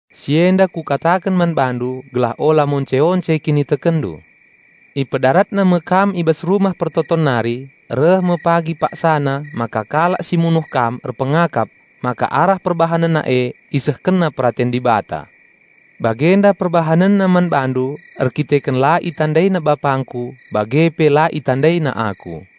"Si enda Kukataken man bandu gelah ola monce-once kinitekenndu. Ipedaratna me kam i bas rumah persembahen nari. Reh me pagi paksana maka kalak si munuh kam erpengakap maka arah perbahanenna e isehkenna peraten Dibata. Bagenda perbahanenna man bandu erdandanken la itandaina BapangKu bage pe la itandaina Aku.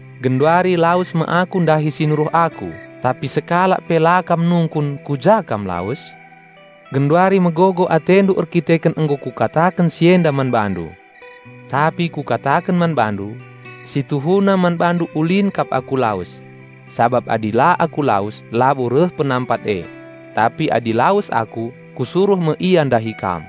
Genduari lawes me Aku ndahi si Nuruh Aku, tapi sekalak pe la kam nungkun, 'Ku ja Kam lawes?' Genduari megogo atendu erdandanken nggo Kukataken si enda man bandu. Tapi Kukataken man bandu: Si tuhuna man bandu ulin kap Aku lawes. Sabap adi la Aku lawes, labo reh Penampat e. Tapi adi lawes Aku, Kusuruh me Ia ndahi kam.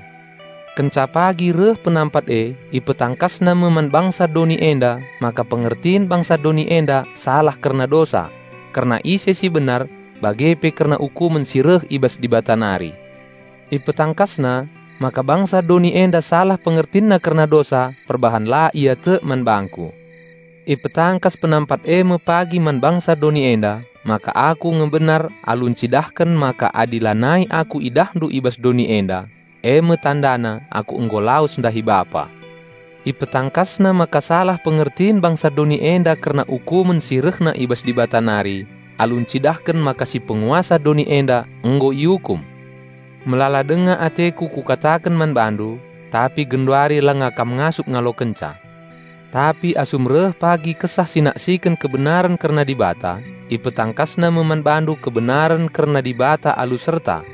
Kenca pagi reh Penampat e IpetangkasNa me man bangsa doni enda maka pengertin bangsa doni enda salah kerna dosa, kerna ise si benar bage pe kerna ukumen si reh i bas Dibata nari. IpetangkasNa maka bangsa doni enda salah pengertinna kerna dosa perbahan la ia tek man bangKu. Ipetangkas Penampat e me pagi man bangsa doni enda maka Aku nge benar alu encidahken maka adi lanai Aku idahndu i bas doni enda, e me tandana Aku nggo lawes ndahi Bapa. IpetangkasNa maka salah pengertin bangsa doni enda kerna ukumen si rehna i bas Dibata nari alu encidahken maka si Penguasa doni enda nggo iukum. Melala denga ateKu Kukataken man bandu, tapi genduari lenga kam ngasup ngalokenca. Tapi asum reh pagi Kesah si naksiken kebenaren kerna Dibata, IpetangkasNa me man bandu kebenaren kerna Dibata alu serta.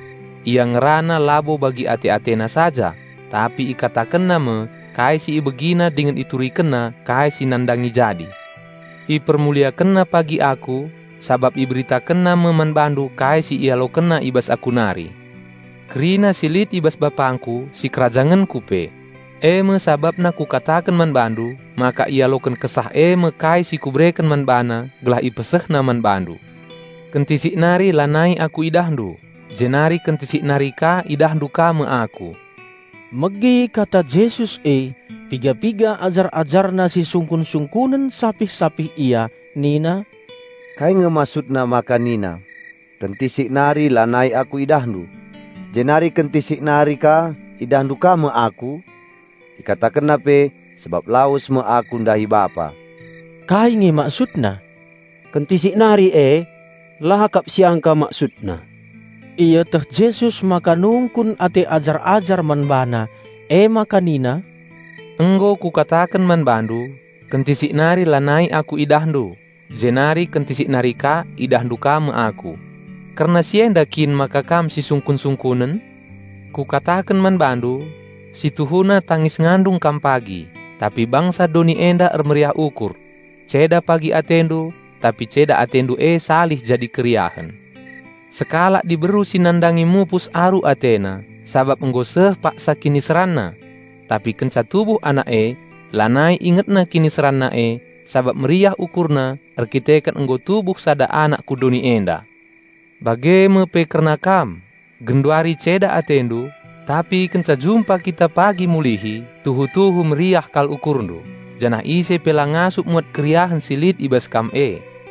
Ia ngerana labo bagi ate-AteNa saja, tapi IkatakenNa me kai si IbegiNa dingen IturikenNa kai si nandangi jadi. IpermuliakenNa pagi Aku, sabap IberitakenNa me man bandu kai si IalokenNa i bas Aku nari. Kerina si lit i bas BapangKu sikerajangenKu pe. E me sabapna Kukataken man bandu maka ialoken Kesah e me kai si Kubereken man BaNa gelah IpesehNa man bandu." "Kentisik nari lanai Aku idahndu, jenari kentisik nari ka idahndu ka me Aku." Megi kata Jesus e, piga-piga ajar-AjarNa sisungkun-sungkunen sapih-sapih ia nina, "Kai nge MaksudNa maka nina, 'Kentisik nari lanai Aku idahndu; jenari kentisik nari ka idahndu ka me Aku?' IkatakenNa pe, 'Sabap lawes me Aku ndahi Bapa.' Kai nge MaksudNa, 'Kentisik nari' e? La kap siangka MaksudNa!" Ieteh Jesus maka nungkun ate ajar-ajar man BaNa, emaka nina, "Nggo Kukataken man bandu, 'Kentisik nari lanai Aku idahndu; jenari kentisik nari ka idahndu ka me Aku.' Kerna si enda kin maka kam sisungkun-sungkunen? Kukataken man bandu: Si tuhuna tangis-ngandung kam pagi, tapi bangsa doni enda ermeriah ukur. Ceda pagi atendu, tapi ceda atendu e salih jadi keriahen. Sekalak diberu si nandangi mupus aru atena, sabap nggo seh paksa kiniseranna. Tapi kenca tubuh anak e, lanai ingetna kiniseranna e, sabap meriah ukurna erdandanken nggo tubuh sada anak ku doni enda. Bage me pe kerna kam: Genduari ceda atendu, tapi kenca jumpa kita pagi mulihi tuhu-tuhu meriah kal ukurndu, janah ise pe la ngasup muat keriahen si lit i bas kam e.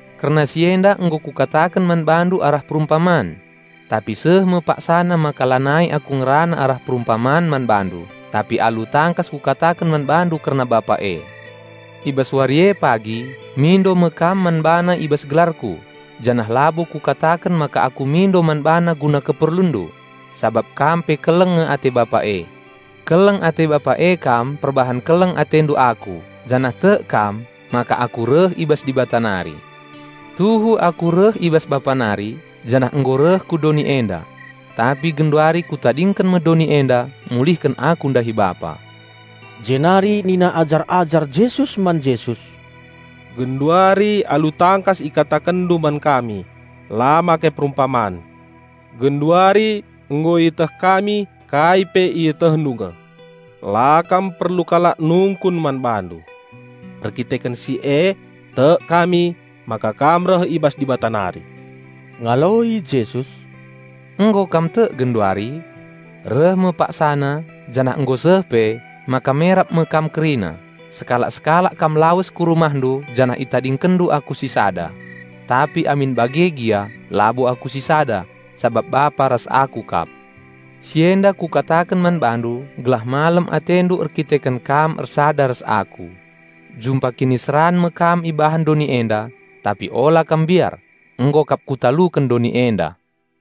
"Kerna si enda nggo Kukataken man bandu arah perumpaman. Tapi seh me paksana maka lanai Aku ngerana arah perumpaman man bandu, tapi alu tangkas Kukataken man bandu kerna Bapa e. I bas wari e pagi mindo me kam man BaNa i bas gelarKu; janah labo Kukataken maka Aku mindo man BaNa guna keperlunndu, sabap kam pe keleng nge ate Bapa e. Keleng ate Bapa e kam perbahan keleng atendu Aku janah tek kam maka Aku reh i bas Dibata nari. Tuhu Aku reh i bas Bapa nari, janah nggo reh ku doni enda. Tapi genduari Kutadingken me doni enda; mulihken Aku ndahi Bapa." Jenari nina ajar-ajar Jesus man Jesus, "Genduari alu tangkas IkatakenNdu man kami, la make perumpaman. Genduari nggo ieteh kami kai pe ietehndu nge; la kam perlu kalak nungkun man bandu. Erdandanken si tek kami maka kam reh i bas Dibata nari." Ngaloi Jesus, "Nggo kam tek genduari? Reh me paksana, janah nggo seh pe, maka merap me kam kerina, sekalak-sekalak kam lawes ku rumahndu janah itadingkenndu Aku sisada. Tapi amin bage gia labo Aku sisada, sabap Bapa ras Aku kap. Si enda Kukataken man bandu gelah malem atendu erkiteken kam ersada ras Aku. Jumpa kiniseran me kam ibahan doni enda. Tapi ola kam mbiar! Nggo kap Kutaluken doni enda!"